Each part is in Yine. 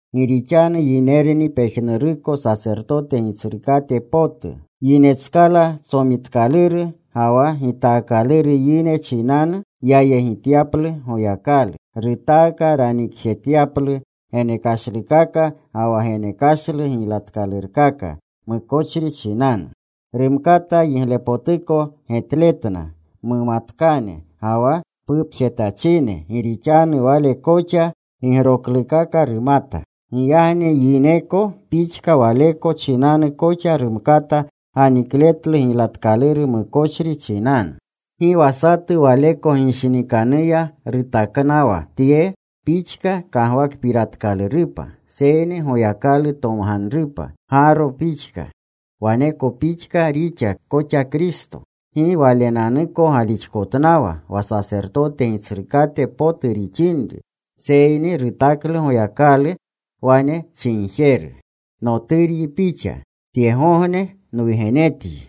Gi rixanu yinerni pejnuruko sasertote gitsrukate potu. Yinetskala tsomitikaluru ga wa gitaakaluru yine chinanu yayegityaplu Goyakalu. Rutaaka ranikjetyaplu genekashlukaka ga wa genekashlu giylatkalurkaka mukochri chinanu. Rumkata yiglepotuko getletna mumatkane ga wa pupjetachine, gi rixanu wale koxa gigroklukaka rumata. Giyagni yineko pixka waleko chinanu koxa rumkata ganikletlu giylatkaluru mukochri chinanu. Gi wa satu waleko ginshinikanuya rutaknawa tye pixka kagwakpiratkalurupa, seyni Goyakalu tomganrupa, Gaaro pixka. Waneko pixka rixa koxa Kristo. Gi Walenanuko galixkotnawa wa sasertote Gitsrukate potu rixinri. Seyni rutaklu Goyakalu, wane chinjeru: Noturyi Pixa. Tyegogne nwugenetyi.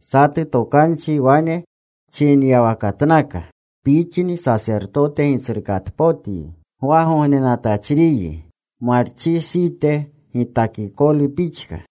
Satu tokanchi wane chinyawakatnaka: Pixni Sasertote Gitsrukatpotyi. Gwagognenatachriyi Marchisite gitakikolu pixka.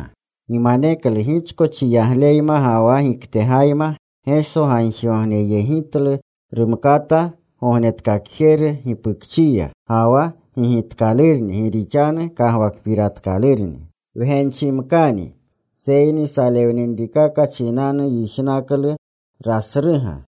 Gimaneklu gichko chiyagleyma ga wa giktegayma Geso gagjigogneyegjetlu rumkata gognetkakjeru gipukchiya. Ga wa gigitkalurni gi rixanu kagwakpiraklerni. Wgenchimkani, seyni salewninrikaka chinanu yijnaklu rasruga.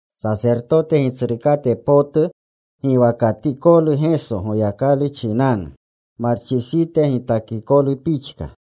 Sasertote Gitsrukate potu giwakatikolu Geso Goyakalu chinanu, Marchisite gitakikolu pixka.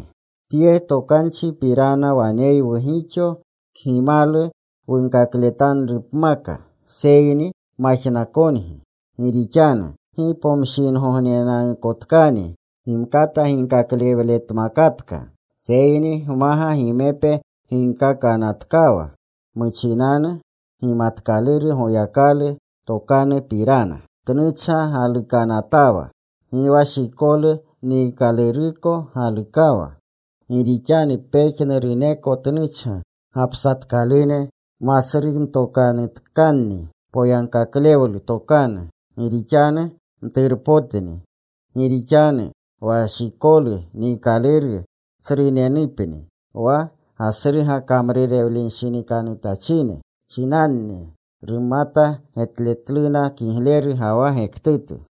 Tye tokanchipirana waneywu gixo kgimalu wunkakletanrupmaka, seyni majnakongi. Gi rixanu gi pomshingognenanukotkani gimkata ginkaklewletmakatka, seyni gmaga gimepe ginkaakanatkawa muchinanu gimatkaluru Goyakalu tokanupirana. Tnuchga galukanatawa. Gi wa shikolu niikaluruko galukawa. Gi rixanu pejnuruneko tnuchga gapsatkalune, masruntokanutkanni poyagkaklewlu tokanu. Gi rixanu mturunpotni. Gi rixanu wa shikolu niikaluru tsrunenupni. Wa gasruga kamrurewlenshinikanutachine chinanni rumata getletluna kigleru ga wa gektutu.